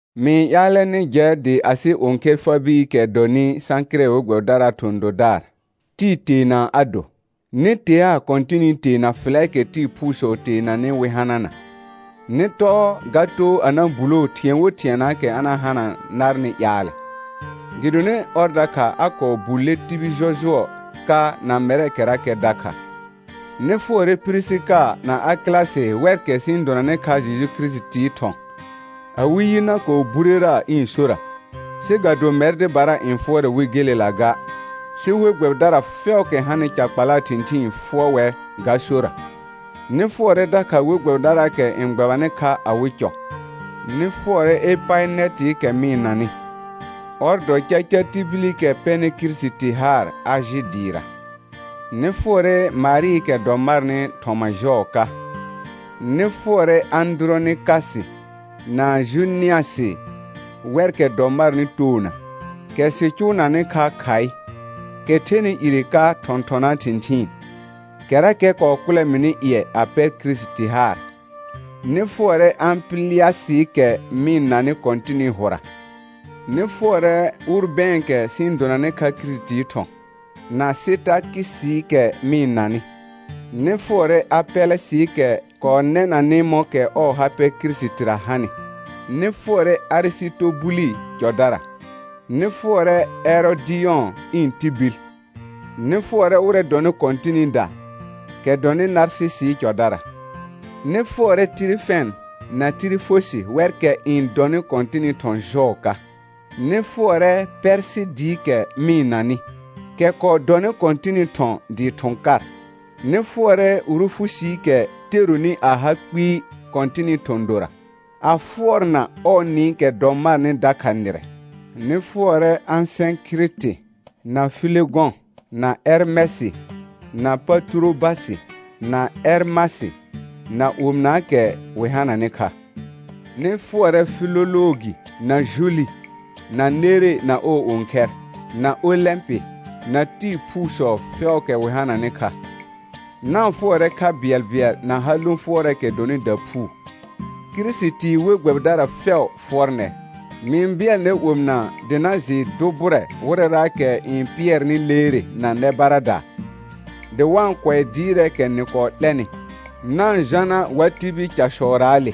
Mɩ-n ƴaalɛ nɩ jɛ dɩ asɩ õkhɛr Eəbeekɛ dɔnɩ Sãkɩrɛ we gbɛbɩdaraa thɔ̃ dodaar, tɩɩ teena a do. Nɩ teaa Kɔ̃tɩnɩ tee na fɩlɛɛkɛ tɩɩ phuusɔ teenanɩ wɩ hanana. Nɩ tɔɔ ga too a na buloo thɩ̃ɛ wo thɩɛnaakɛ a na hana narnɩ ƴaalɛ, gɩdonɩ ɔr dakha a kɔɔ bulle tibil jɔjʋɔ ka na mɛrkɛrakɛ dakha. Nɩ fʋɔrɛ Pirisika na Akɩlasɩ wɛrkɛ sɩ-n donanɩ kha Jeju Kirisitii thɔ̃. Awɩ yi na kɔɔ burera ɩ̃ sora, sɩ ga do mɛr dɩbara n fʋɔrɛ wɩ gelela ga, sɩ we gbɛbɩdara fɛʋʋkɛ hanɩ ca kpalaa thɩ̃thɩɩn fʋɔr wɛr ga sora. Nɩ fʋɔrɛ dakha we gbɛbɩdaraakɛ n gbɛbanɩ kha awɩ cɔ. Nɩ fʋɔrɛ Epaɩnɛtɩɩkɛ mɩ-n nanɩ, ɔr dɔ caca tibilikɛ pɛnɩ Kirisiti haar Ajɩ dɩɩra. Nɩ fʋɔrɛ Marɩɩkɛ dɔ marnɩ thɔma jɔɔ ka. Nɩ fʋɔrɛ Ãdʋrɔnɩkasɩ na Junɩasɩ wɛrkɛ dɔ marnɩ toona, kɛ sɩ cʋʋnanɩ kha khaɩ, kɛ thɛnɩ ire ka thɔ̃thɔnaa thɩ̃thɩɩn, kɛrakɛ kɔɔ kʋlɛ mɩnɩ ƴɩɛ a pɛr Kirisiti haar. Nɩ fʋɔrɛ Ãpɩlɩasɩɩkɛ mɩ-n nanɩ Kɔ̃tɩnɩ hʋra. Nɩ fʋɔrɛ Ʋrbɛ̃ɛkɛ sɩ-n donanɩ kha Kirisitii thɔ̃, na Sɩtakɩsɩɩkɛ mɩ-n nanɩ. Nɩ fʋɔrɛ Apɛlɛsɩɩkɛ kɔɔ nɛnanɩ mɔ̃kɛ ɔɔ ha pɛ Kirisitira hanɩ. Nɩ fʋɔrɛ Arɩsɩtobulɩ cɔdara. Nɩ fʋɔrɛ Ɛrɔdɩyɔ̃ ɩ̃ tibil; nɩ fʋɔrɛ wɩrɛ dɔnɩ Kɔ̃tɩnɩda, kɛ dɔnɩ Narsɩsɩɩ cɔdara. Nɩ fʋɔrɛ Tɩrɩfɛn na Tɩrɩfosɩ wɛrkɛ n dɔnɩ Kɔ̃tɩnɩ thɔ̃ jɔɔ ka. Nɩ fʋɔrɛ Pɛrsɩɩdɩɩkɛ mɩ-n nanɩ, kɛ kɔɔ dɔnɩ Kɔ̃tɩnɩ thɔ̃ dɩɩ thʋ̃ kar. Nɩ fʋɔrɛ Rufusiikɛ teronɩ a ha kpɩɩ Kɔ̃tɩnɩ thɔ̃ dora, a fʋɔrna ɔɔ nɩɩkɛ dɔ marnɩ dakha nɩrɛ. Nɩ fʋɔrɛ Asɛ̃kɩrɩtɩ, na Filegɔ̃, na Ɛrmɛsɩ, na Paturobasɩ, na Ɛrmasɩ, na omɩnaakɛ wɩ hananɩ kha. Nɩ fʋɔrɛ Filoloogi, na Juli, na Nere na ɔɔ õkhɛr, na Olɛ̃pɩ, na tɩɩ phuusɔ fɛʋʋkɛ wɩ hananɩ kha. Na-n fʋɔrɛ kha bɩɛlbɩɛl na ha lõ fʋɔrɛɛkɛ dɔnɩ daphuu. Kirisitii we gbɛbɩdara fɛʋ fʋɔr nɛr. Mɩ-n bɩɛl nɛr omɩna dɩ na jɩɩ dʋ bʋrɛ wɩrɛraakɛ n pɩɛrnɩ leere na nɛ baradaa, dɩ wa-n kʋɛ dɩɩrɛɛkɛ nɩ kɔɔ 'lɛnɩ; na-n jana wa tibil casɔraale.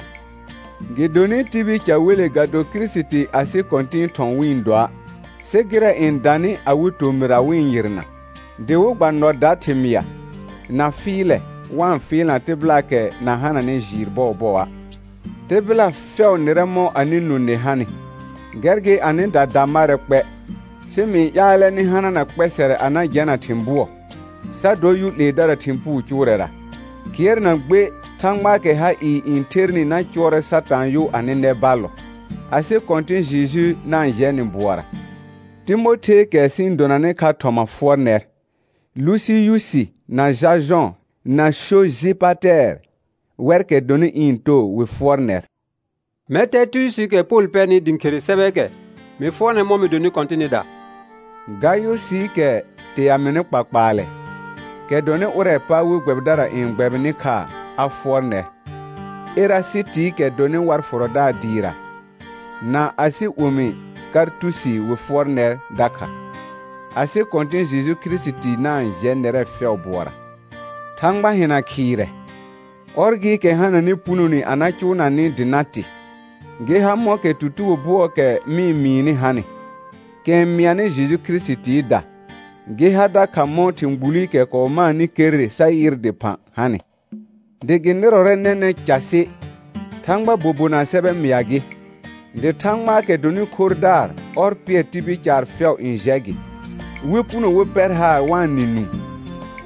Gɩdonɩ tibil ca wele ga do Kirisiti asɩ Kɔ̃tɩ̃ɩ thɔ̃ wɩ-n doa', sɩ gɩrɛ n danɩ awɩ tomɩra wɩ-n yɩrna; dɩ wɩ gba nɔ da thɩmɩa, na fɩɩlɛ, wa-n fɩɩlna tɩbɩlaakɛ na hananɩ jɩɩr bɔɔbɔa'. Tɩbɩla fɛʋ nɩrɛ mɔ̃ anɩ nũ nɩ hanɩ, gɛr gɩ anɩda da marɛ kpɛ, sɩ mɩ-n ƴaalɛ nɩ hanana kpɛsɛrɛ a na jɛna thɩ̃ bʋɔ, sa dɔ yʋ 'leedara thɩ̃ puu cʋʋrɛra. Kɩɛr na gbe Thãgbaakɛ ha ɩɩ n thernɩ na cʋɔrɛ Satãa yʋ anɩ nɛ ballɔ. Asɩ Kɔ̃tɩ̃ Jeju na-n jɛ nɩ bʋɔra. Timotheekɛ sɩ-n donanɩ kha thɔma fʋɔr nɛr; Lusiyusi na Jajɔ̃ na Sojɩpatɛɛr wɛrkɛ dɔnɩ ɩ̃ too wɩ fʋɔr nɛr. Mɛr Tɛrtiyusiikɛ Pol pɛrnɩ dɩ ɩ̃ khere sɛbɛɛkɛ, mɩ fʋɔr nɛr mɔ̃ nɩ donɩ Kɔ̃tɩnɩda. Gayʋsɩɩkɛ tea mɩnɩ kpakpaalɛ, kɛ dɔnɩ ʋrɛɛ pa we gbɛbɩdara n gbɛbɩnɩ kha, a fʋɔr nɛr. Erasɩtɩɩkɛ dɔnɩ war fʋrɔdaar dɩɩra, na asɩ omi Kartusi wɩ fʋɔr nɛr dakha. [Asɩ Kɔ̃tɩ̃ Jeju Kirisiti na-n jɛ nɛrɛ fɛʋ bʋɔra.] Thãgba hɩna khɩɩrɛ, ɔr gɩɩkɛ hananɩ punone a na cʋʋna nɩ dɩ na tɩ, gɩ ha mɔ̃kɛ tutugo bʋɔɔkɛ mɩ-n mɩɩnɩ hanɩ, kɛ n mɩanɩ Jeju Kirisitiida, gɩ ha dakha mɔ̃ thɩ̃ gbulikɛ kɔɔ maanɩ kerre sa yɩr dɩphã hanɩ, dɩ gɩ nɩrɔrɛ nɛnɛ̃ casɩ, Thãgbaa bobonaa sɛbɛ mɩa gɩ; dɩ Thãgbaakɛ dɔnɩ khorrdaar ɔr pɩɛr tibil caar fɛʋ n jɛ gɩ, wɩ puno wɩ pɛr haar wa-n nɩ nũu.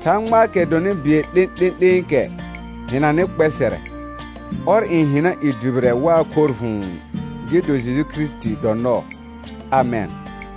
Thãgbaakɛ dɔnɩ bɩɛl 'lẽ'lẽ'lẽekɛ hɩnanɩ kpɛsɛrɛ, ɔr n hɩna i dʋbɩrɛ waa khorr vʋ̃ʋ, gɩ do Jeju Kirisiti dɔ nɔɔ. Amɛn.